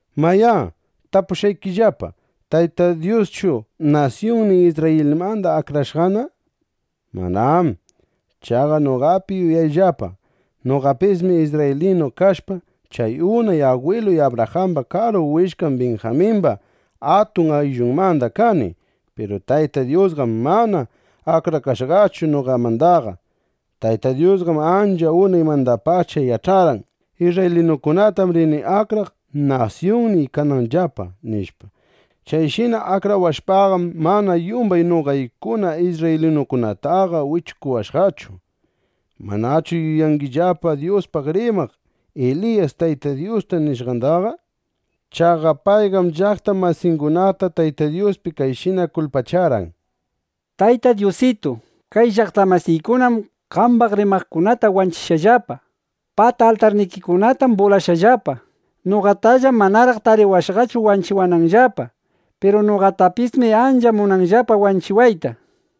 Mayá, tapushqaykillapa: ¿Tayta Dyuschu nasyunnin Isrrayilmanda akrakashqana? ¡Manám! Chaqa noqapi yuyayllapa. Noqapismi isrraylinu kashpa, chay unay agwiluy Abrajamba karu willkan Binjamimba atun ayllunmanda kani. Piru Tayta Dyusqam mana akrakashqachu noqamandaqa. Tayta Dyusqam ancha unaymandapacha yach'arqan: Isrraylinukunatam rini akraq, nasyunniy kananllapa, nishpa. Chayshina akrawashpaqam, mana yumbay noqaykuna isrraylinukunataqa wichukuwashqachu. ¿Manachu yuyangillapa Dyuspaq rimaq Eliyas Tayta Dyusta nishqandaqa? Chaqa payqam llaqta masingunata Tayta Dyuspi kayshina kulpacharqan: “Tayta Dyusitu, kay llaqta masiykunam qambaq rimaqkunata wanchishqallapa. Pata altarnikikunatam bulashqallapa. Noqatallam manaraq tariwashqachu wanchiwananllapa. Piru noqatapismi ancha munanllapa wanchiwayta”, nishpa.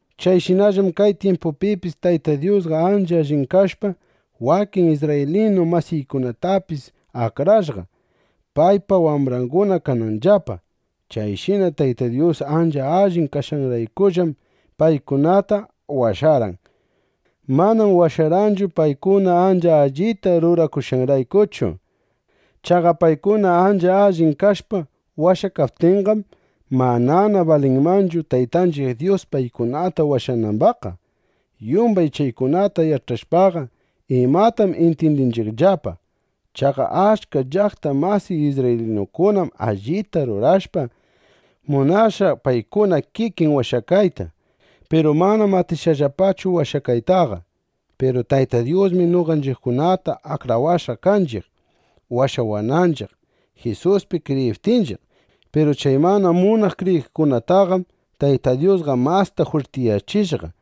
Chayshinallam kay tyimpupipis Tayta Dyusqa ancha allin kashpa, wakin isrraylinu masiykunatapis akrashqa, paypa wambranguna kananllapa. Chayshina Tayta Dyus ancha allin kashqanraykullam paykunata washarqan. Manam washarqanchu, paykuna ancha allita rurashqanraykuchu. Chaqa paykuna ancha allin kashpa washakaptinqam, manana balinmanchu Taytanchiq Dyus paykunata washanambaqqa. Yumbay chaykunata yach'ashpaqa, ¿imatam intyindinchiqllapa? Chaqa achka llaqta masiy isrraylinukunam allita rurashpa, munashqa paykuna kikin washakayta. Piru manam atishqallapachu washakaytaqa. Piru Tayta Dyusmi noqanchiqkunata akrawashqa kanchiq, washawananchiq, Jisuspi kriyiptinchiq. Piru chay mana munaq kriyiqkunataqam Tayta Dyusqa masta jwirtiyachishqa,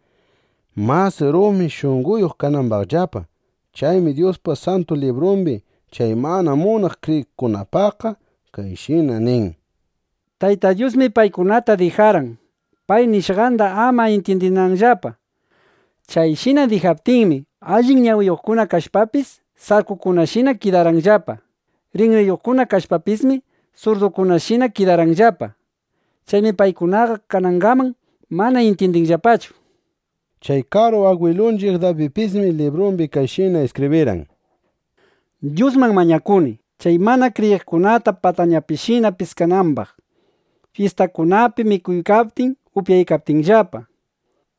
mas rumi shunqoyuq kanambaqllapa. Chaymi Dyuspa Santu Librumbi chay mana munaq kriyiqkunapaqqa kayshina nin: “Tayta Dyusmi paykunata dijarqan, pay nishqanda ama intyindinanllapa. Chayshina dijaptinmi, allin ñawiyuqkuna kashpapis, sarkukunashina kidarqanllapa. Rinriyuqkuna kashpapismi, surdukunashina kidarqanllapa, Chaymi paykunaqa kanangaman mana intyindinllapachu”, nishpa. Chay karu agwilunchiq Dabidpismi librumbi kayshina iskibrirqan: Dyusman mañakuni, chay mana kriyiqkunata patañapishina piskanambaq, fyistangunapi mikuykaptin, upyaykaptinllapa.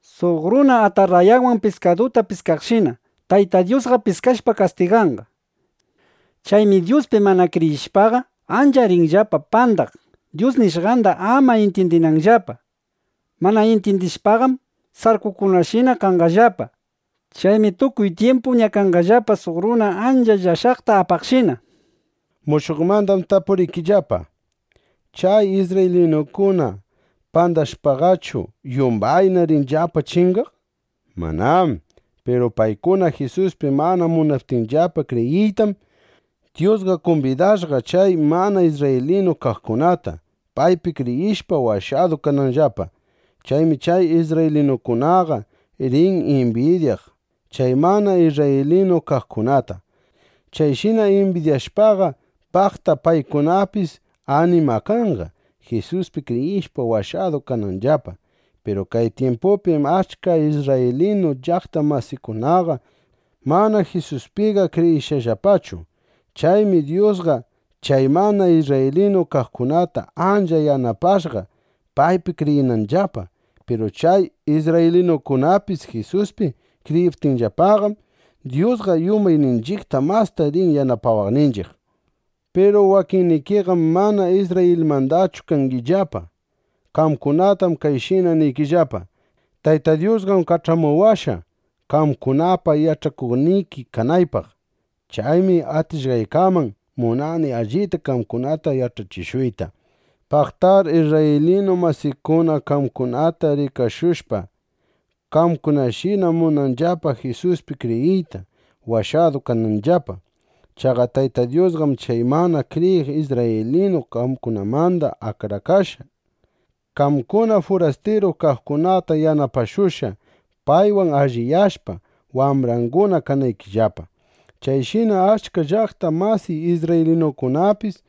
Suq runa atarrayawan piskaduta piskaqshina Tayta Dyusqa piskashpa kastiganqa. Chaymi Dyuspi mana kriyishpaqa, ancha rinllapa pandaq, Dyus nishqanda ama intyindinanllapa. Mana intyindishpaqam, sarkukunashina kanqallapa. Chaymi tukuy tyimpu ñakanqallapa suq runa ancha llashaqta apaqshina, nishpa. Mushuqmandam tapuriykillapa: ¿Chay isrraylinukuna pandashpaqachu, yumbayna rinllapa chingaq? ¡Manám! Piru paykuna Jisuspi mana munaptinllapa kriyiytam, Dyusqa kumbidashqa chay mana isrraylinu kaqkunata, paypi kriyishpa washadu kananllapa. Chaymi chay isrraylinukunaqa rin imbidyaq chay mana isrraylinu kaqkunata. Chayshina imbidyashpaqa, paqta paykunapis animakanqa, Jisuspi kriyishpa washadu kananllapa. Piru kay tyimpupim achka isrraylinu llaqta masiykunaqa mana Jisuspiqa kriyishqallapachu. Chaymi Dyusqa chay mana isrraylinu kaqkunata ancha yanapashqa, paypi kriyinanllapa. Piru chay isrraylinukunapis Jisuspi kriyiptinllapaqam, Dyusqa yumbayninchiqta masta rin yanapawaqninchiq. Piru wakinnikiqam mana Isrrayilmandachu kangillapa. Qamkunatam kayshina niykillapa: Tayta Dyusqam kach'amuwashqa, qamkunapa yach'achikuqniki kanaypaq. Chaymi atishqaykaman munani allita qamkunata yach'achishuyta. Paqtar isrraylinu masiykuna, qamkunata rikashushpa, qamkunashina munanqallapa Jisuspi kriyiyta, washadu kananllapa. Chaqa Tayta Dyusqam chay mana kriyiq isrraylinu kaqkunamanda akrakashpa, qamkuna furastiru kaqkunata yanapashushqa, paywan alliyashpa, wambranguna kanaykillapa. Chayshina achka llaqta masiy isrraylinukunapis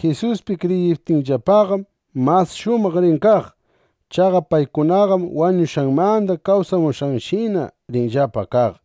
Jisuspi kriyiptinllapaqam, mas shumaq rin kaq. Chaqa paykunaqam wañushqanmanda kawsamushqanshina rinllapa kaq.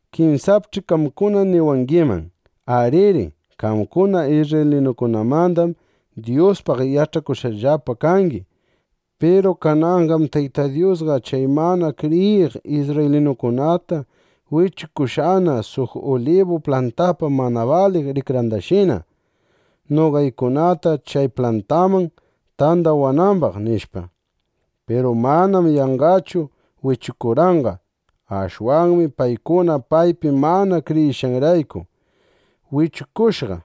Kinsapch'i qamkuna niwangiman: Ariri. Qamkuna isrraylinukunamandam Dyuspaq yach'akushqallapa kani. Piru kananqam Tayta Dyusqa chay mana kriyiq isrraylinukunata wichukushqana suq ulibu plantapa mana baliq rikrandashina, noqaykunata chay plantanman tandawanambaq, nishpa. Piru manam yanqachu wichukurqanqa. Ashwanmi paykuna paypi mana kriyishqanrayku, wichukushqa.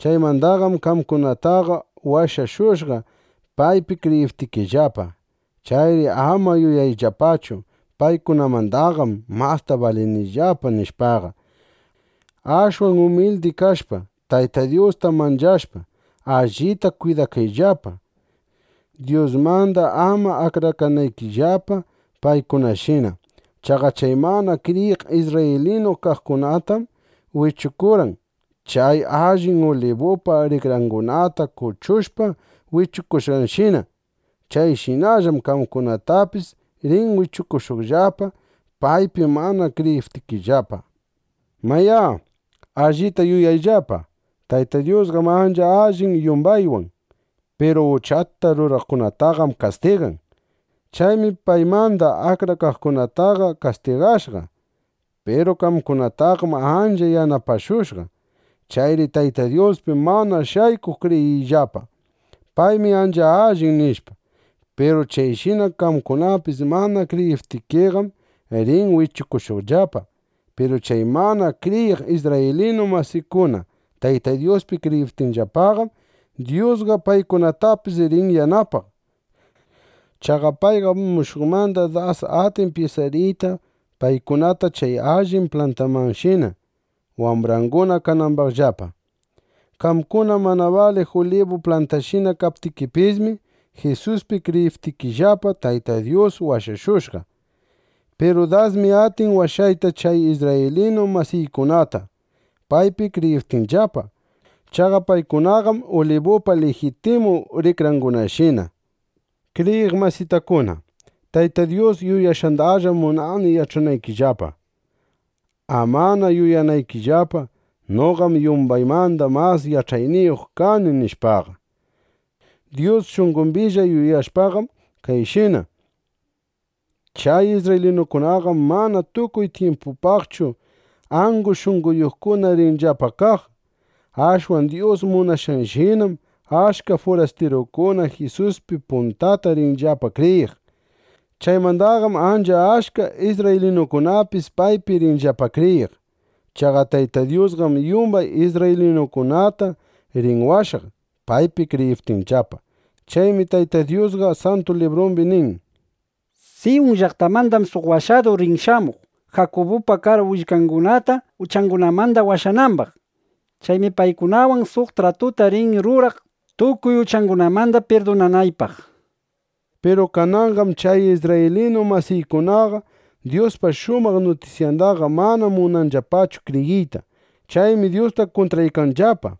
Chaymandaqam qamkunataqa washashushqa, paypi kriyiptikillapa. Chayri ama yuyayllapachu: Paykunamandaqam masta balinillapa, nishpaqa. Ashwan umildi kashpa, Tayta Dyusta manchashpa, allita kwidakayllapa, Dyusmanda ama akrakanaykillapa paykunashina. Chaqa chay mana kriyiq isrraylinu kaqkunatam wichukurqan, chay allin ulibupa rikrangunata kuchushpa wichukushqanshina. Chayshinallam qamkunatapis rin wichukushuqllapa, paypi mana kriyiptikillapaqa. Mayá, ¡allita yuyayllapa! Tayta Dyusqam ancha allin yumbaywan. Piru uchata ruraqkunataqam kastigan. Chaymi paymanda akrakaqkunataqa kastigashqa. Piru qamkunataqam ancha yanapashushqa. Chayri Tayta Dyuspi mana shaykuq kriyiyllapa: Paymi ancha allin, nishpa. Piru chayshina qamkunapis mana kriyiptikiqam, rin wichukushuqllapa. Piru chay mana kriyiq isrraylinu masiykuna Tayta Dyuspi kriyiptinllapaqam, Dyusqa paykunatapis rin yanapaq. Chaqa payqam mushuqmanda das atin pyisariyta paykunata chay allin plantamanshina, wambranguna kanambaqllapa. Qamkuna mana baliq ulibu plantashina kaptikipismi, Jisuspi kriyiptikillapa, Tayta Dyus washashushqa. Piru dasmi atin washayta chay isrraylinu masiykunata, paypi kriyiptinllapa. Chaqa paykunaqam ulibupa lijitimu rikrangunashina. Kriyiq masitakuna, Tayta Dyus yuyashqandallam munani yach'anaykillapa, amana yuyanaykillapa: Noqam yumbaymanda mas yach'ayniyuq kani, nishpaqa. Dyus shunqombilla yuyashqanqam kayshina: Chay isrraylinukunaqam mana tukuy tyimpupaqchu angu shunqoyuqkuna rinllapa kaq. Ashwan Dyus munashqanshinam achka furastirukuna Jisuspi puntata rinllapa kriyiq. Chaymandaqam ancha achka isrraylinukunapis paypi rinllapa kriyiq. Chaqa Tayta Dyusqam yumbay isrraylinukunata rin washaq, paypi kriyiptinllapa. Chaymi Tayta Dyusqa Santu Librumbi nin: Siyun llaqtamandam suq Washadur rin shamuq, Jakubupa karu willkangunata uchangunamanda washanambaq. Chaymi paykunawan suq tratuta rini ruraq tukuy uchangunamanda pirdunanaypaq, nishpa. Piru kananqam chay isrraylinu masiykunaqa Dyuspa shumaq nutisyandaqa mana munanllapachu kriyiyta. Chaymi Dyusta kuntraykanllapa.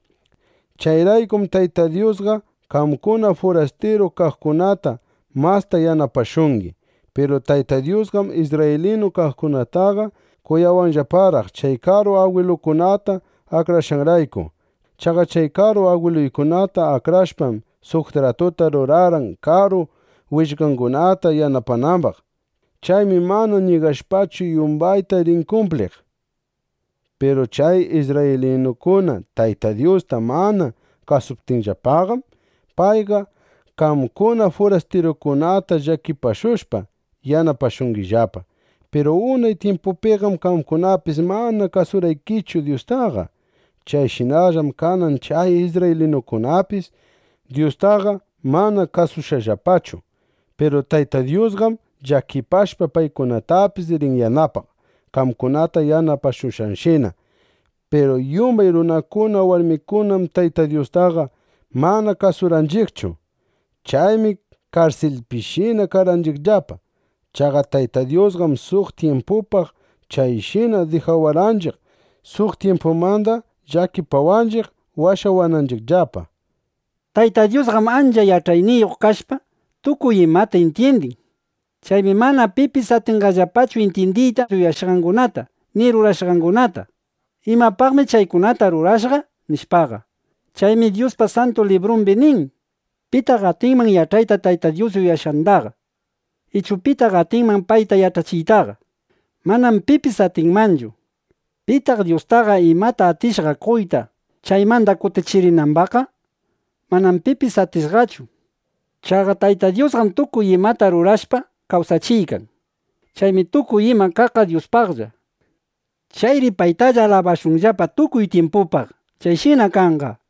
Chayraykum Tayta Dyusqa qamkuna furastiru kaqkunata masta yanapashuykangi. Piru Tayta Dyusqam isrraylinu kaqkunataqa kuyawanllaparaq, chay karu agwiluykunata akrashqanrayku. Chaqa chay karu agwiluykunata akrashpam, suq tratuta rurarqan, karu willkangunata yanapanambaq. Chaymi mana ñigashpachu, yumbayta rin kumpliq. Piru chay isrraylinukuna Tayta Dyusta mana kasuptinllapaqam, payqa qamkuna furastirukunata llakipashushpa, yanapashungillapa. Piru unay tyimpupiqam qamkunapis mana kasurqaykichu Dyustaqa. Chayshinallam kanan chay isrraylinukunapis Dyustaqa mana kasushqallapachu. Piru Tayta Dyusqam llakipashpa paykunatapis rin yanapaq, qamkunata yanapashushqanshina. Piru yumbay runakuna warmikunam Tayta Dyustaqa mana kasurqanchiqchu. Chaymi karsilpishina karqanchiqllapa. Chaqa Tayta Dyusqam suq tyimpupaq chayshina dijawarqanchiq, suq tyimpumanda llakipawaqninchiq washawananchiqllapa. ¡Tayta Dyusqam ancha yach'ayniyuq kashpa, tukuy imata intyindin! Chaymi mana pipis atinchiqllapachu intyindiyta yuyashqangunata, ni rurashqangunata: ¿imapaqmi chaykunata rurashqa? nishpaqa. Chaymi Dyuspa Santu Librumbi nin: “¿Pitaq atinman yach'ayta Tayta Dyus yuyashqandaqa? ¿Ichu pitaq atinman payta yach'achiytaqa?” (Manam pipis atinmanchu.) “¿Pitaq Dyustaqa imata atishqa qoyta, chaymanda kutichirinambaqqa?” (Manam pipis atishqachu.) Chaqa Tayta Dyusqam tukuy imata rurashpa, kawsachiykan. Chaymi tukuy ima kaqqa Dyuspaqlla. Chayri ¡paytalla alabashunllapa tukuy tyimpupaq! ¡Chayshina kanqa!